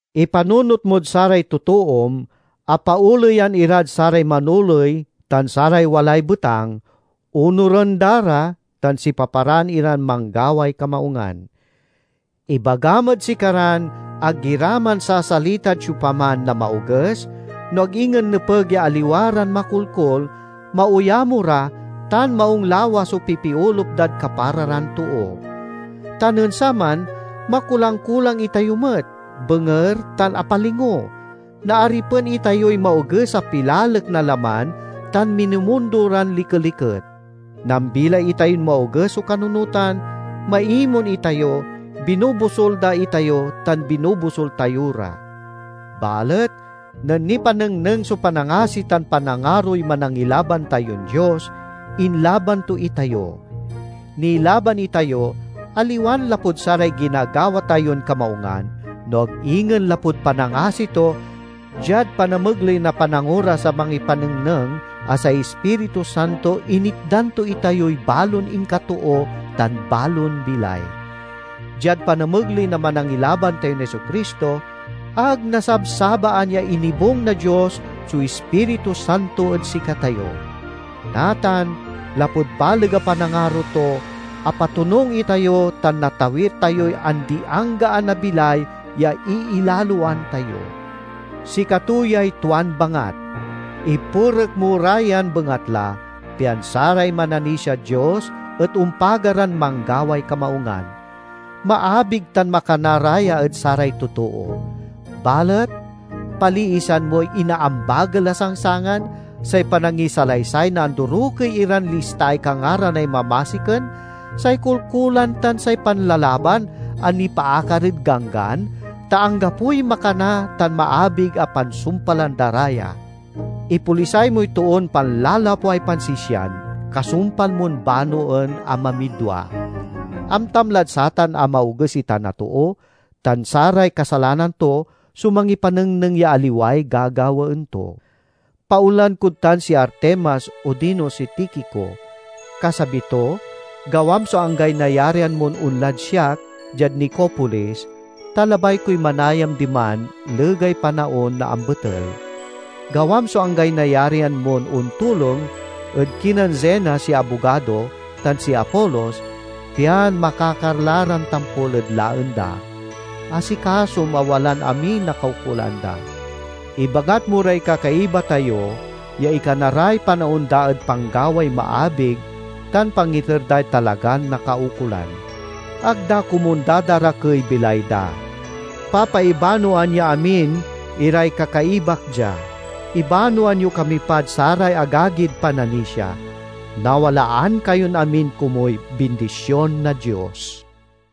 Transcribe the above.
Ipanunot mod saray totoom a paoleyan irad saray manoley tan saray walay betang, onuren da ra, tan sipaparaan iran manggaway kamaungan. Ibagam ed sikaran ag ira mansasalitad siopaman na maoges, no ag ingen nepeg ya aliwa ran makolkol, maoyamo ra, tan maung lawas so pipiolup dad kapara ran too. Ta nen saman makulang-kulang itayo met, benger, tan apalingo. Naaripen itayoy maoges a pilalek na laman tan minumundo ran likeliket. Nambilay itayon maoges so kanunotan, maimon itayo; binobosul da itayo tan binobosul tayo ra. Balet nen nipanengneng so panangasi tan panangaroy Manangilaban tayon Dios, inlaban to itayo. Nilaban itayo, aliwan lapud saray ginagawa tayon kamaungan, no ag ingen lapud panangasi to, diad panamegley na panangoras a mangipanengneng a say Ispiritu Santo initdan to itayoy balon inkatoo tan balon bilay. Diad panamegley na Manangilaban tayon Jesu-Cristo, ag nasabsabaan ya inibung na Dios so Ispiritu Santo ed sikatayo. Natan lapud baleg a panangaro to, apatonung itayo tan natawir tayoy andi-anggaan a bilay ya iilaloan tayo. Sikato yay tuan bangat. Ipurek mo ra yan bengatla, pian saray mananisiad Dios et ompaga ran manggaway kamaungan. Maabig tan makana ra ya ed saray totoo. Balet paliisan moy inaambagel a sangsangan, say panangisalaysay na andorokey iran listaay kangaranay mamasiken, say kolkolan tan say panlalaban a nipaakar ed Ganggan, ta anggapoy makana tan maabig a pansumpalan da ra ya. Ipolisay moy toon panlalapway pansisian, kasumpal mon banoen a mamidwa. Amtam lad satan a maoges itan a too, tan saray kasalanan to so mangipanengneng ya aliway gagawaen to. Paonlaen kod tan si Artemas odino si Tikico. Kasabi to, gawam so anggaay nayarian mon onlad siak diad Nicopolis, ta labay koy manayam diman legay panaon na ambetel. Gawam so anggaay nayarian mon ontulong ed kinen Zenas ya abogado tan si Apolos, pian makakar la ran tampol ed laen da. Asikasom a walan amiy nakaukolan da. Ibangat mo ray kakaiba tayo ya ikana ray panaon da ed panggaway maabig tan pangiter day talagan nakaukolan. Ag da komun dadarakey bilay da. Papaibanoan ya amin iray kakaibak dia. Ibanoan yo kami pad saray agagid pananisia. Nawalaan kayon amin komuy bindision na Dios.